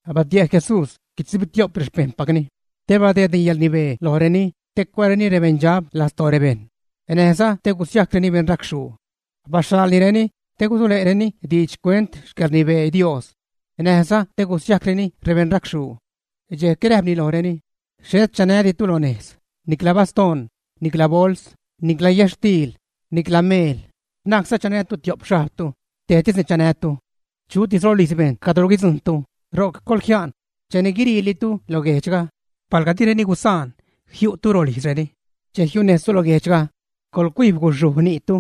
Batie' Jesús guitzubitio'p rexpejṉpacni te badeedni yäḻrnibee lojreni te cuääreni rebeṉdxab lastoo rebejṉ, näjza te gusiajcreni rebeṉracxhuu. Baxhaḻnireni te gusule'reni diidx xcuent xcäḻrnibee Dios näjza te gusiajcreni rebeṉracxhuu. Dxejc räjpni lojreni: ―Xhet chanäditu lo nejz, nicla bastoṉ, nicla bols, nicla yätxtiil, nicla meel; na'cza chanätu tio'p xhajbtu; tejtisni chanätu. Chutis rolijz bejṉ cadro guidzujṉtu, ro'c coḻjia'n cheni guiriilitu lo guejdxga. Palga direni gusaan jiu'tu rolijzreni, che jiunejztu lo guejdxga, coḻcuijb guxhuj ni'tu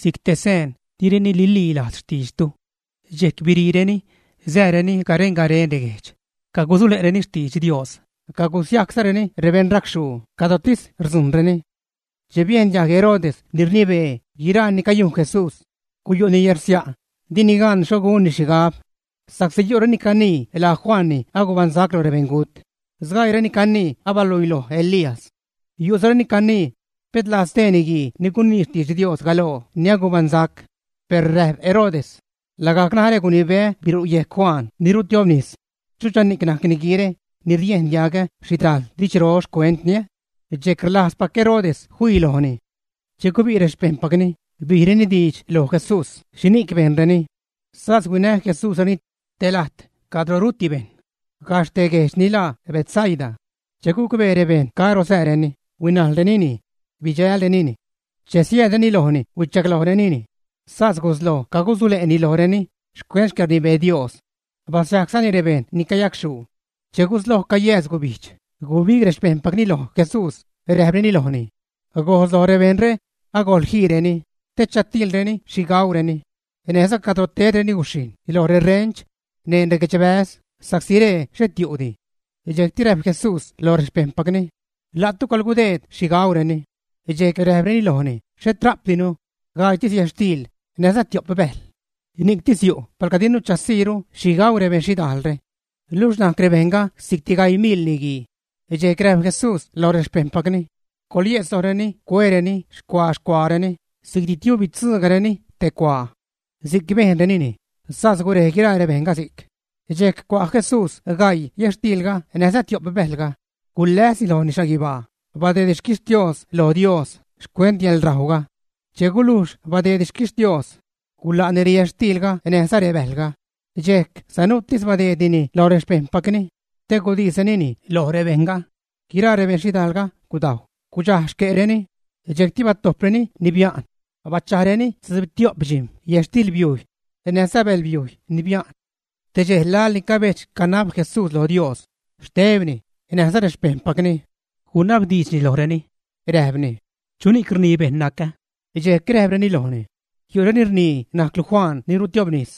si'c te seen direni nililajz xtiidxtu. Dxejc biriireni sääreni garen-garen reguejdx, cagusule'reni xtidx Dios, cagusiajczareni rebeṉracxhuu cadrotis rdzujṉreni. Che biejn diajg Herodes ni rnibee guiraa ni cayujn Jesús, guyu'ni yärsia', dini gan xho gunni xhigab, sa'csi yu' reni canii laa Juan ni agubaṉsac lo rebeṉgut. Sgaiireni canii abaluiloj Elías. Yu'zareni canii pet laa stee niguii ni gunii xtidx Dios galoo ni agubaṉsac. Per räjp Herodes: ―Lagajc narä gunibeä biru' yejc Juan ni rutiobnis, ¿chuchani'c najc niguiire ni riejn diagä xhidajl didxro xcuentni? Dxejc rlajzpac Herodes fii lojni. Che gubi' rexpejṉpacni, bijreni diidx loj Jesús xhini'c bejnreni. Sas huinä Jesúsreni te lajt cadro ruti bejṉ, gajxh te guejdx ni laa Betsaida. Che gucbee rebejṉ caro sääreni, huinajlrenini bidxälrenini. Che siäädreni lojni huichaglojnireni, sas gusloj cagusule'ni lojreni xcuent xcäḻrnibee Dios. Basiajczani rebejṉ ni cayacxhuu. Che gusloj cayääz gubijdx, gubig rexpejṉpacni loj Jesús, räjpreni lojni: ―Gojs loj rebejṉre, agojḻ jiireni te chatiilreni xhi gaureni, näjza cadro tedreni guxhijṉ lo rerench, neṉ reguedxbäz, sa'csi ree xhet yu'di. Dxejcti räjp Jesús loj rexpejṉpacni: ―¡La'tu coḻgudeed xhi gaureni! Dxejc räjpreni lojni: ―Xhet rajpdinu, gaiitis yätxtiil näjza tio'p bäjl. Ni'ctis yu' palga dinu chasiiru xhi gau rebeṉ xhidajlre. Luxh najc rebejṉga si'cti gaii miḻ niguii. Dxejc räjp Jesús loj rexpejṉpacni: ―Coḻyejtz lojreni cuereni xcua-xcuaareni, si'cti tiuubitzugajreni te cuaa. Si'c bejnrenini, sas gurej guiraa rebejṉga si'c. Dxejc cua' Jesús gaii yätxtiilga näjza tio'p bäjlga, guläsni lojni xhaguibaa, badeedni xquixtios lo Dios xcuent yäḻrajwga. Che gulujx badeedni xquixtios gula'ni reyätxtiilga näjza rebäjlga, dxejc sanuutis badeednini loj rexpejṉpacni te gudisrenini loj rebejṉga. Guiraa rebeṉ xhidaalga gudajw, gudxaj xque'reni. Dxejcti batojpreni ni bia'n bachajreni tzubitio'p dxijm̲ yätxtilbiujy näjza bälbiujy ni bia'n. Te dxej laḻni cabedx-canab Jesús lo Dios, xtebni näjza rexpejṉpacni, gunabdiidxni lojreni, räjpni: ―¿Chuni'c rnii rebejṉ nacä? Dxejc räjpreni lojni: ―Yu'reni rnii najclu Juan ni rutiobnis;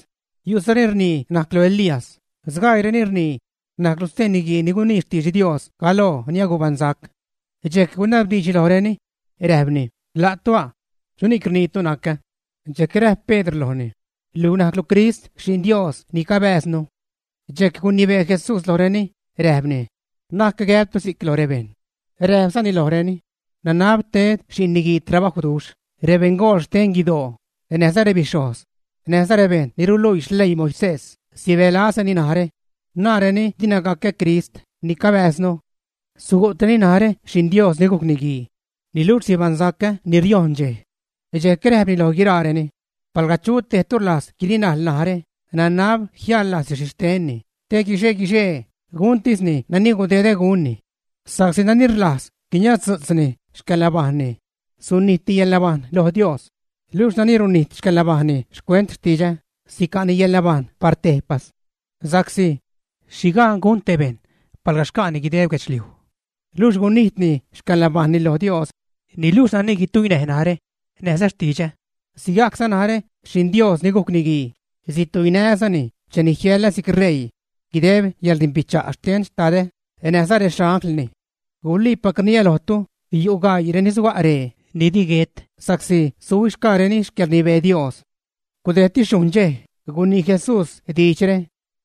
yu'zareni rnii najclu Elías; sgaiireni rnii najclu stee niguii ni gunii xtidx Dios galoo ni agubaṉsac. Dxejc gunabdiidxni lojreni, räjpni: ―¿La'tu a? ¿Chuni'c rniitu nacä? Dxejc räjp Pedr lojni: ―Luj najclu Crist Xi'n Dios ni cabääznu. Dxejc gunibee Jesús lojreni, räjpni: ―Na'c gäbtu si'c lo rebejṉ. Räjpzani lojreni: ―Nanab ted Xi'n Niguii trabajwduxh; rebeṉgool xten guidoo, näjza rebixhojz, näjza rebejṉ ni ruluii xleii Moisés sibälazreni narä, naareni dina gacä Crist ni cabääznu. Sugu'treni narä Xi'n Dios ni gujc Niguii, niluxh sibaṉsacä ni riojṉ dxej. Dxejc räjpni loj guiraareni: ―Palga chu tejtu rlajz guirinajl narä, nanab jiäḻlajzni xhixtenni, te guixe-guixee guntisni nani gudedä gunni. Sa'csi nani rlajz guiniazdzu'tzni xcäḻnabajṉni, sunijtni yälnabajṉ lo Dios; luxh nani runijt xcäḻnabajṉni xcuent xtidxä, sica'ni yäḻnabajṉ par tejpas. Sa'csi ¿xhi gaan gun te bejṉ palga xca'ni guideb guedxliuj, luxh gunijtni xcäḻnabajṉni lo Dios? Niluxh nani guituinäj narä näjza xtidxä, sigajcza narä, Xi'n Dios ni gujc Niguii, situinää́zani cheni jiäḻä si'c ṟeii guideb yäḻrdimbicha' xten Xtadä näjza rexanglni. Guliipac rniä lojtu, yu' gaii reni suga' ree, ni di guet, suhuixgaareni xcäḻrnibee Dios. Gudejdti xhujṉ dxej gunii Jesús diidxre,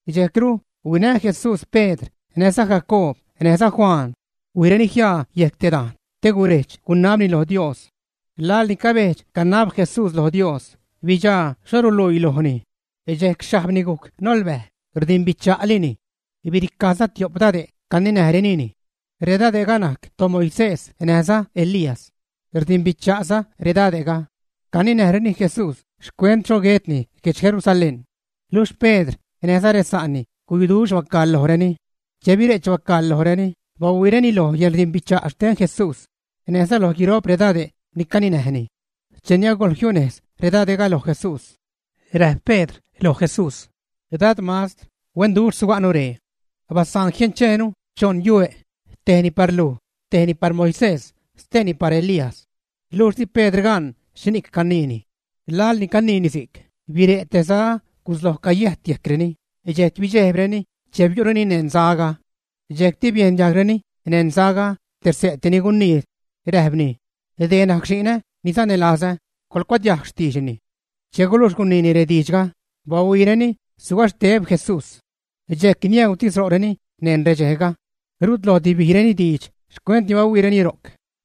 dxejcru huinä Jesús Pedr näjza Jacoob näjza Juan, huijreni jiaa yejc te dajn te guredx-gunabni loj Dios. Laḻni cabedx-canab Jesús lo Dios, bidxaa xho ruluii lojni; dxejc xhajbni gujc nolbäj, rdimbicha'lini. Biricajza tio'p dade' caninäjrenini. Redade'ga najc toMoisés näjza Elías. Rdimbicha'za redade'ga. Caninäjreni Jesús xcuent xho guetni guedx Jerusalén. Luxh Pedr näjza resa'ni guyuduxh bacaḻ lojreni; che bire'ch bacaḻ lojreni bahuiireni lo yäḻrdimbicha' xten Jesús näjza loj guiro'p redade' ni caninäjni. Cheni agojl jiunejz redade'ga loj Jesús, räjp Pedr loj Jesús: ―Dad, Mastr, huenduxh suga'nu ree. Basaan jiencheenu choṉ yue', tejni par luj, tejni par Moisés, steeni par Elías. Luxh di Pedr gaan xhini'c caniini. Laḻni caniini si'c, bire' te za gusloj cayäjt yejcreni, dxejc bidxejbreni che biu'reni neṉ zaga. Dxejcti biejn diajgreni neṉ zaga te xse' te ni gunii, räjpni: ―Dee najc Xi'nä ni sanälazä, coḻcuadiajg xtiidxni. Che gulujx guniini rediidxga, bahuiireni sugaxteb Jesús. Dxejc niäutis ro'reni neṉ redxejga, rut lojdi bijreni diidx xcuent ni bahuiireni ro'c.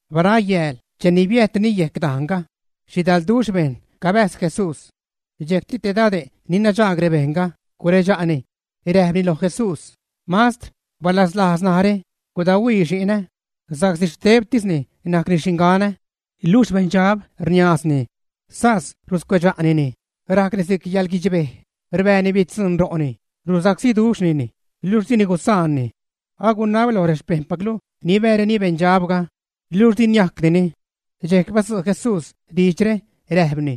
Barayääl cheni biäjtreni yejc dajnga, xhidalduxh bejṉ cabäjz Jesús. Dxejcti te dade' ni nadxaag rebejṉga guredxa'ni, räjpni loj Jesús: ―Mastr, balaslajz narä, gudahuii xi'nä, sa'csi xtebtisni najcni xinganä. Luxh beṉdxab rniaazni, sas ruscuedxa'nini, rajcni si'c yäḻguidxbej, rbääni bitzuṉ ro'ni, rusacsíduxhnini, luxh dini gusaanni. Agunabä loj rexpejṉpaclu nibääreni beṉdxabga, luxh di niajcdini. Dxejc badzu' Jesús diidxre, räjpni: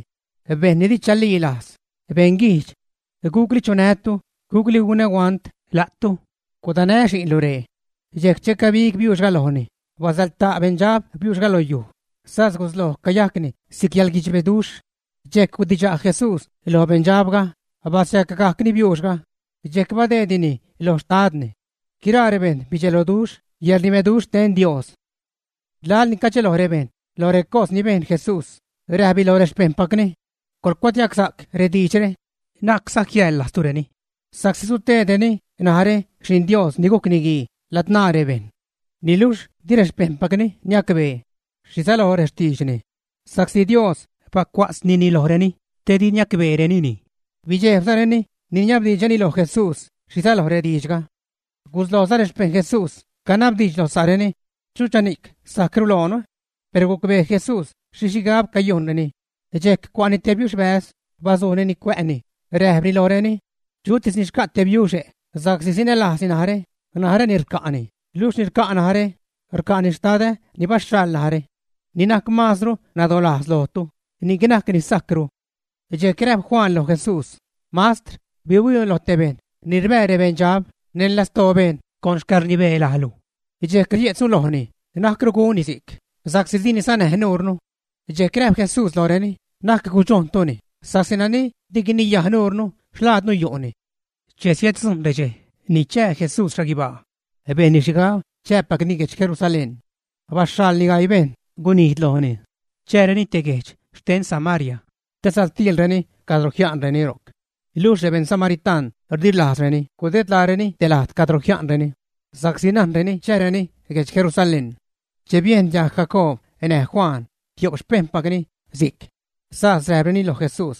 ―¡Bejṉ ni di chalilajz, beṉguijdx! ¿Gucli chunää́tu, gucli gunä huant la'tu? ¡Gudanä xi'nlu ree! Dxejc che cabig biuuxga lojni, basäḻta' beṉdxabga biuuxga lo yuj, sas gusloj cayajcni si'c yäḻguidxbeduxh. Dxejc gudidxa' Jesús loj beṉdxabga, basiacgajcni biuuxga, dxejc badeednini lo xtadni. Guiraa rebejṉ bidxeloduxh yäḻrnibeduxh xten Dios. Laḻni cadxeloj rebejṉ lo recos ni bejṉ Jesús, räjpni loj rexpejṉpacni: ―Coḻcuadiajgsa'c rediidxre, na'cza jiäḻlajztureni, sa'csi sutedreni narä Xi'n Dios ni gujc Niguii ladzṉaa rebejṉ. Niluxh di rexpejṉpacni niacbee xhi säloj rextiidxni, sa'csi Dios bacua'tznini lojreni te di niacbeerenini. Bidxejbzareni niniabdiidxreni loj Jesús xhi säloj rediidxga. Guslojza rexpejṉ Jesús canabdiidx lo sa'reni: ―¿Chuchani'c sajcru loonu? Per gucbee Jesús xhi xhigab cayujnreni. Dxejc cua'ni te biuxbäz, bazujnini cuä'ni, räjpni lojreni: ―Chutis ni xca' te biuxe' sa'csi sanälajzni narä, naräni rca'ni luxh ni rca' narä, rca'ni xtadä ni baxhaḻ narä. Ni najc maazru nadolajz lojtu, ni'c najc ni sajcru. Dxejc räjp Juan loj Jesús: ―Mastr, bihuiinu loj te bejṉ ni rbää rexpeṉdxab neṉ lastoo bejṉ con xcäḻrnibee lajlu. Dxejc rie'tznu lojni na'cru gunni si'c, sa'csi dini sanäj nuurnu. Dxejc räjp Jesús lojreni: ―Na'c gudxojntuni, sa'csi nani di guiniyaj nuurnu, xlaadnu yu'ni. Che siäddzujṉ redxej ni chää Jesús xhaguibaa, bejnni xhigab chääpacni guedx Jerusalén. Baxhaḻni gaii bejṉ gunijd lojni chääreni te guejdx xten Samaria te satiilreni cadro jia'nreni ro'c. Luxh rebejṉ samaritaṉ di rlajzreni gudedlaareni te lajt cadro jia'nreni, sa'csi najnreni chääreni guedx Jerusalén. Che biejn diajg Jacoob näj Juan, tio'p xpejṉpacni, si'c, sas räjpreni loj Jesús: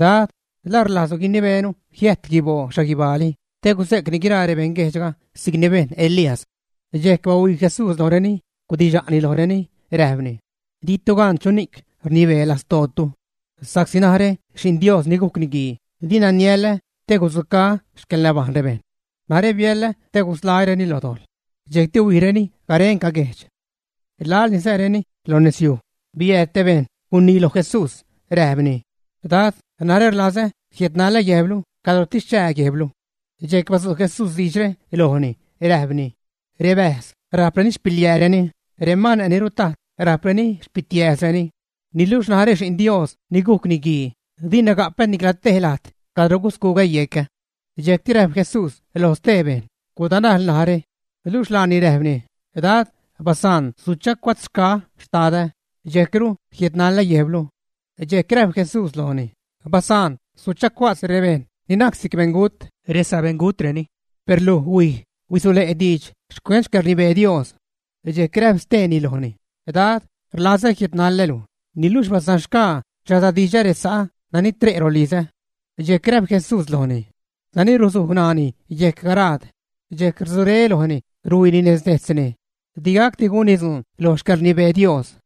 ―Dad, ¿La rlajzlu guinibeenu jiäjt guiboo xhaguibaali te guze'cni guiraa rebeṉguejdxga si'cni bejn Elías? Dxejc bahuii Jesús lojreni, gudidxa'ni lojreni, räjpni: ―Ditu gaan chuni'c rnibee lastootu. Sa'csi narä Xi'n Dios ni gujc Niguii dina niäḻä te gudzucaä xcäḻnabajṉ rebejṉ. Narä biäḻä te gusḻaä́reni lo dojḻ. Dxejcti huijreni garenca guejdx. Laḻni sääreni lo nezyuj, biääd te bejṉ gunii loj Jesús, räjpni: ―Dad, narä rlazä jiädnalä guejblu cadrotis chää guejblu. Dxejc badzu' Jesús diidxre lojni, räjpni: ―Rebäjz rajp xpiliääreni, remane' ni rutajt rajp xpitiääzreni, niluxh narä Xi'n Dios ni gujc Niguii, dina gapä nicla te lajt cadro guscugä yecä. Dxejcti räjp Jesús lo stee bejṉ: ―Gudanajl narä. Luxh laani räjpni: ―Dad, basaan suchacua'tzxgaä́ xtadä, dxejcru jiädnalä guejblu. Dxejc räjp Jesús lojni: ―Basaan suchacua'tz rebejṉ ni najc si'c beṉgut, resabeṉgutreni. Per luj, huij, huisule' diidx xcuent xcäḻrnibee Dios. Dxejc räjp steeni lojni: ―Dad, rlazä jiädnaḻä́lu, niluxh basanxgaa chasadidxä resa'ä ni tre' rolizä. Dxejc räjp Jesús lojni: ―Nani ruzuj ṉaani yejc garaad, dxejc rudzuré lojni ruhuiini nez dejtzni di gacdi gunni dzuun lo xcäḻrnibee Dios.